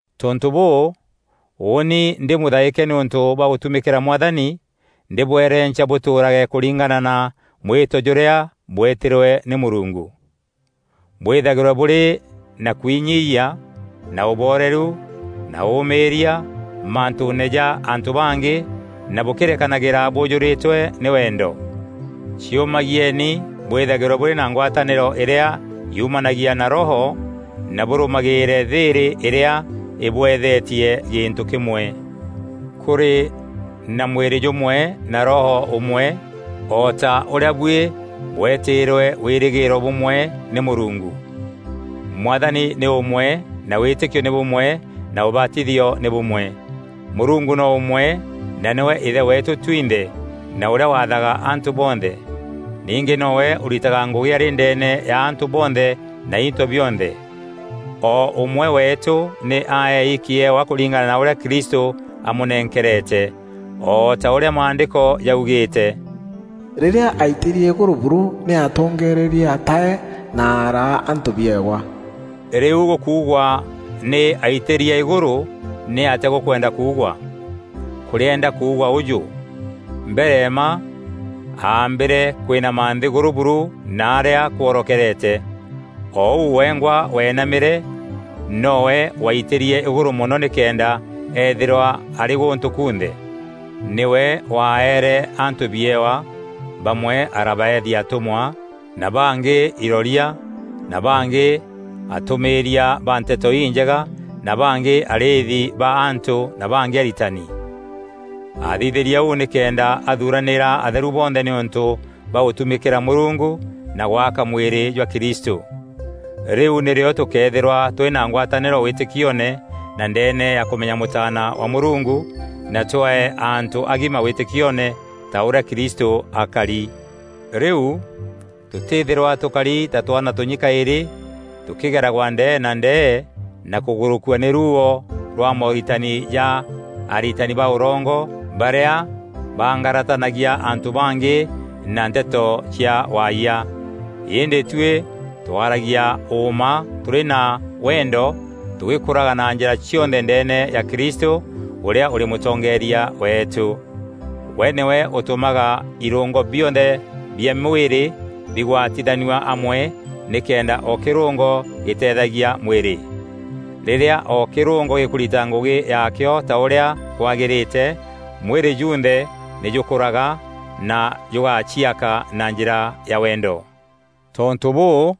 Tontû bûû, ûûni ndî mûthaîke nîûntû bwa gûtumîkîra Mwathani, ndîbwerenca bûtûûrage kûringana na mwîto jûrîa bwetîrwe nî Mûrungu. Bwîthagîrwe burî na kwinyiiyia na ûbooreru na ûûmîîria mantûûne ja antû bangî na bûkîrekanagîra bûjûrîtwe nî wendo. Ciûmagieni bwîthagîrwe bûrî na ngwatanîro îrîa yumanagia na Roho na bûrûmagîîre thîîrî îrîa îbweethetie gîntû kîmwe. Kûrî na mwîrî jûmwe na Roho ûmwe, o ta ûrîa buî bwetîîrwe wîrîgîîro bûmwe nî Mûrungu. Mwathani nî ûmwe na wîtîkio nî bûmwe na ûbatithio nî bûmwe; Mûrungu no ûmwe na nîwe Ithe weetû twinthe na ûrîa wathaga antû bonthe. Ningî nowe ûritaga ngûgî arî ndeene ya antû bonthe na into bionthe. O ûmwe weetû nî aei kîewa kûringana na ûrîa Kristû amûnenkerete. O ta ûrîa Maandîko jaugîîte: “Rîrîa aitîrie îgûrû buru, nî atongerîrie atae; na araa antû biewa.” Rîu gûkuugwa: “Nî aitîrie îgûrû,” nî atîa gûkwenda kuugwa? Kûrîenda kuugwa ûjû: mbere mma aambîre kwînama nthîgûrû buru naarîa kworokerete. O ûu wengwa wenamîre, nowe waitîrie îgûrû mono nîkenda eethîrwa arî gûntû kunthe. Nîwe waeere antû biewa; bamwe arabaethia atûmwa, na bangî iroria, na bangî atûmîîria ba Nteto Injega, na bangî arîîthi ba antû na bangî aritani. Aathithîrie ûu nîkenda athuranîra atheru bonthe nîûntû bwa gûtumîkîra Mûrungu na gwaka mwîrî jwa Kristû. Rîu nîrîo tûkeethîrwa tûrî na ngwatanîro wîtîkioone na ndeene ya kûmenya Mûtaana wa Mûrungu; na twee antû agima wîtîkioone ta ûrîa Kristû akari. Rîu, tûtîîthîrwa tûkari ta twaana tûnyi kaîrî, tûkîgeragwa ndee na ndee na kûgûrûkua nî ruuo rwa mooritani ja aritani ba ûrongo barîa bangaratanagia antû bangî na nteto cia waayia. Îndî tuî, twaragia ûûma tûrî na wendo tûgîkûraga na njîra cionthe ndeene ya Kristû, ûrîa ûrî mûtongeeria weetû. We nîwe ûtûmaga irûngo bionthe bia mwîrî bigwatithanua amwe nîkenda o kîrûngo gîteethagia mwîrî. Rîrîa o kîrûngo gîkûrita ngûgî yaakîo ta ûrîa kwagîrîte, mwîrî junthe nî jûkûraga na jûgaciaka na njîra ya wendo. Tontû bûû,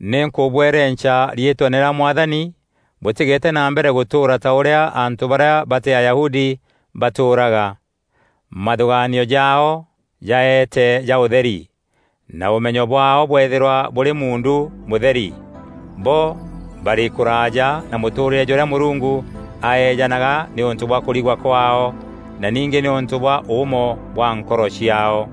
nî nkûbwerenca riîtweene rîa Mwathani bûtîgete na mbere gûtûûra ta ûrîa antû barîa batî Ayahudi batûûraga. Mathûgaanio jaao jaeete ja ûtheri, na ûmenyo bwaao bweethîrwa bûrî muundu mûtheri. Bo barî kûraaja na mûtûûrîre jûrîa Mûrungu aeejanaga nîûntû bwa kûrigwa kwaao na ningî nîûntû bwa ûûmo bwa nkoro ciaao.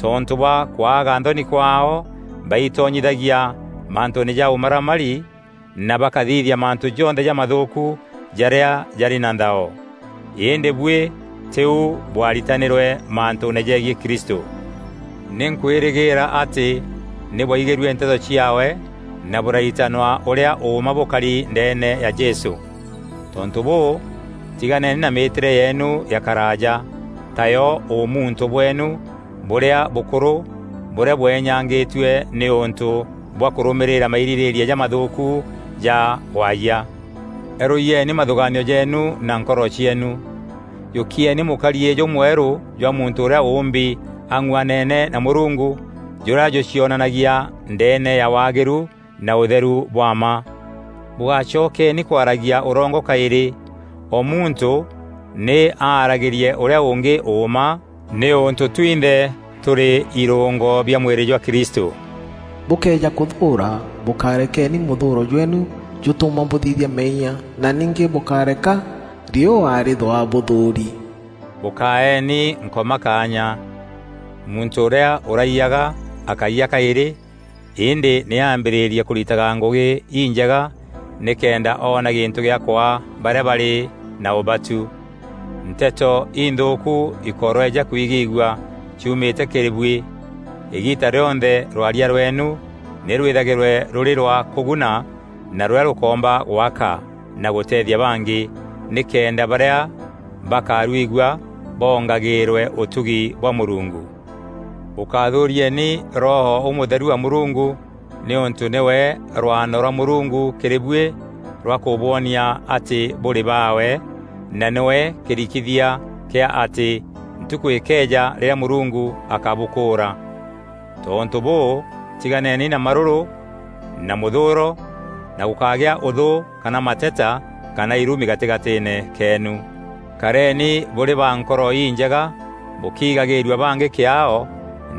Tontû bwa kwaga nthoni kwaao, baitonyithagia mantûûne ja ûmaramari na bakathithia mantû jonthe jamathûûku jarîa jarî na nthao. Îndî buî tîu bwaritanîrwe mantûûne jegiî Kristû. Nî nkwîrîgîîra atî nî bwaigîrue nteto ciaawe na bûraritanwa ûrîa ûûma bûkari ndeene ya Jesû. Tontû bûû, tiganeni na mîîtîre yeenu ya karaaja, tayo ûmuntû bweenu bûrîa bûkûrû bûrîa bweenyangîtue nîûntû bwa kûrûmîrîra mairîrîîria jamathûûku ja waayia. Erûyieni mathûgaanio jeenu na nkoro cieenu. Jûkieni mûkariî jûmwerû jwa muntû ûrîa ûûmbi ang'uanene na Mûrungu jûrîa jûcionanagia ndeene ya waagîru na ûtheru bwa mma. Bûgácokeeni kwaragia ûrongo kaîrî. O muntû nî aaragîrie ûrîa ûngî ûûma, nîûntû twinthe tûrî îrûngo bia mwîrî jwa Kristû. Bûkëeja kûthûûra, bûkarekeni mûthûûro jweenu jûtûma bûthithia meeyia na ningî bûkáreka riûa rîthûa bûthûûri. Bûkáeni Nkoma kaanya. Muntû ûrîa ûraiyaga, akáiya kaîrî, îndî nî ambîrîrie kûritaga ngûgî injega nîkenda oona gîntû gîa kwaa barîa barî na ûbatu. Nteto inthûûku ikoroeja kwigîîgua ciumîte kîrî buî; îgiita rîonthe rwaria rweenu nî rwîthagîrwe rûrî rwa kûguna na rûrîa rûkoomba gwaka na gûteethia bangî, nîkenda barîa bakarwigua bongagîîrwe ûtugi bwa Mûrungu. Bûkáthûrieni Roho Ûmûtheru wa Mûrungu nîûntû nîwe rwano rwa Mûrungu kîrî buî rwa kûbwonia atî bûrî baawe, na nîwe kîrikithia kîa atî ntukû îkeeja rîrîa Mûrungu akabûkûûra. Tontû bûû, tiganeni na marûrû na mûthûûro na gûkágîa ûthû kana mateta kana irumi gatîgatîîne keenu. Kareni bûrî ba nkoro injega bûkiigagîîrua bangî kîaao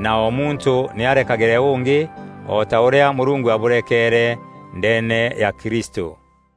na o muntû nî arekagîre ûngî o ta ûrîa Mûrungu abûrekeere ndeene ya Kristû.